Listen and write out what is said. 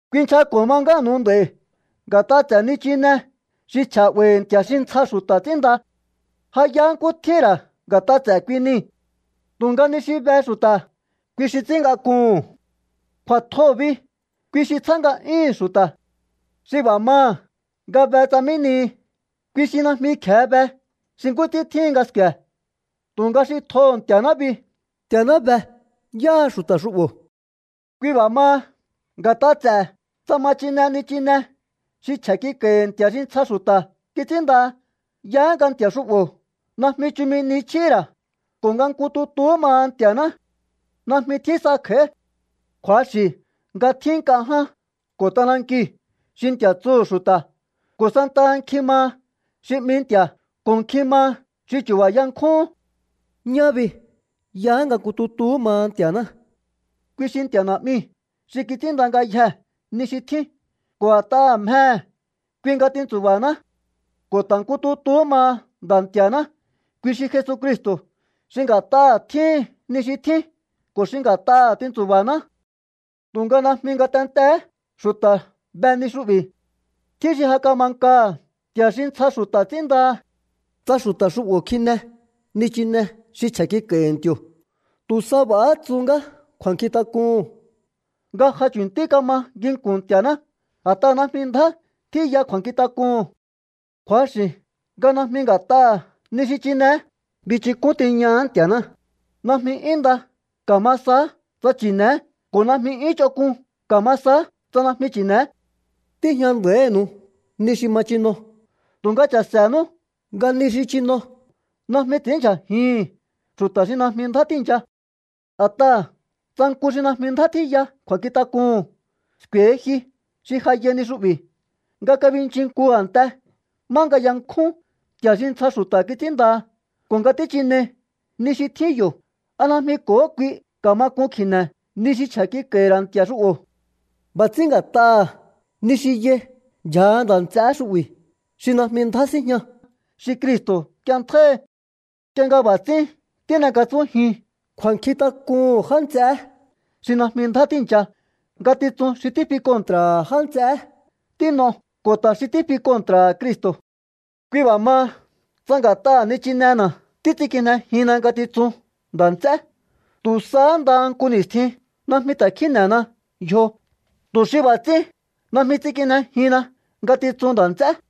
Kuinchjako̱ ma ngánu̱u nd'a̱i̱ nga̱t'a ts'e̱ nichine xi chje̱ 'ba̱i̱hi̱ nti̱a̱ xi ntsja xu̱ta̱ ts'ínnda. Ja yaá nkú tjíhi̱n ra̱ nga̱t'a ts'e̱ kui nii̱. Tu̱nga ni xi be xu̱ta̱, kui xi ts'ín ngak'uhu̱n. Kju̱a̱tjoo̱ bi, kui xi tsjá nga'yúhu̱n xu̱ta̱. Xi b'a̱ maha̱ nga be tsa mí nihi, kui xi najmi kje̱e be xi nkú ts'ín tjíhin nga sku̱e̱. Tu̱nga xi tjoho̱ Nti̱a̱ná bi, Nti̱a̱ná be yáha xu̱ta̱ xu'bo̱. Kui b'a̱ maha, nga̱t'a ts'e̱ tsa ma chine nichine xi chje̱ kik'a̱i̱hi̱ nti̱a̱ xi ntsja xu̱ta̱ kits'ínndaha, yaá nga nti̱a̱ xu'bo̱ najmi chumi ni chjíhi̱ ra̱ ko̱ nga nku tutuhú maha Nti̱a̱ná. Najmi tjín sa kj'a̱í. Kju̱axi̱ nga tjín nk'a ján ko̱ t'anankiu̱ xi nti̱a̱ tsuhu̱ xu̱ta̱, ko̱ santaha nkjin maha xi 'mi nti̱a̱ ko̱ nkjin maha xi chu̱ba̱ yankjúhún. Ñá bi, nku tutuhú maha Nti̱a̱ná. Kui xi Nti̱a̱ Na̱'miu̱ xi kits'ínnda ngayjee̱ ni xi tjín ko̱ a̱t'aha̱ mjehe̱ kui nga tintsu̱ba̱haná. Ko̱ ta̱ nku tutuhú maha Nda̱ Nti̱a̱ná, kui xi Jesucristo̱ xi nga̱t'aha̱ tjíhin ni xi tjín ko̱ xi nga̱t'aha̱ tintsu̱ba̱haná. Tu̱nga najmi ngatentee̱hé xu̱ta̱ be ni xu'bi̱. Tjín xi ja kama nkaha̱ nti̱a̱ xi ntsja xu̱ta̱ ts'ínndaha̱. Tsa xu̱ta̱ xu'bo̱ kjine nichine xi chje̱ kik'a̱i̱hi̱ nti̱o̱, tu̱ sa b'a̱há tsu ngá kju̱a̱nkjintak'uhu̱n nga ja chu̱ntí kama nginku̱n Nti̱a̱ná, a̱t'aha̱ najmi ndjá tjíya kju̱a̱nkjintak'uhu̱n. Kju̱axi̱ nga najmi nga̱t'aha̱ ni xi chineé binchúk'un tiñaha̱á Nti̱a̱ná. Najmi 'yún nda ka̱ma saá tsa chi̱ne̱é ko̱ najmi 'yún ch'onk'un ka̱ma saá tsa najmi chi̱ne̱é. Tíjña nda̱ínu̱u ni xi ma chino, tu̱nga cha̱se̱nú nga ni xi chino najmi ts'i̱ínndyjajihi̱n xu̱ta̱ xi najmi ndjá tíi̱ncha. A̱t'aha̱ tsa nku xi najmi ndjá tjíya kju̱a̱nkjintak'uhu̱n sku̱e̱hi ji xi ja yai ni xu'bi̱ nga kabinchin nku a̱nte má yankjún nti̱a̱ xi ntsja xu̱ta̱ kits'ínndaha ko̱ nga tíchinei ni xi tjín yo̱, ¿a najmi ko̱hó kui ka̱ma k'un kji̱ne̱ ni xi chje̱ kik'a̱i̱hi̱ ra̱ nti̱a̱ xu'bo̱? B'a̱ ts'ín nga̱t'aha̱ ni xi yai ndyja̱ha nda̱ nts'eé xu'bi̱ xi najmi ndjá síjña, xi Cristo̱ k'ienntjáíhi. Nk'ie nga b'a̱ ts'ín tín'ekatsúnjiun kju̱a̱nkjintak'uhu̱n já nts'eé xi najmi ndjá tíi̱ncha, ngatitsun xi tífi kontra̱ha̱ já nts'eé tín'o ko̱ ta̱ xi tífi kontra̱ha̱ Cristo̱. Kui b'a̱ maha, tsa nga̱t'aha̱ nichinena̱ títs'inkijnejihinna ngatitsun nda̱ nts'é, tu̱ sahá ndaha nku ni̱stjin najmi ta̱ kjíne̱hena yjo, tu̱ xi b'a̱ ts'ín najmi ts'inkijnejihinna ngatitsun nda̱ nts'é.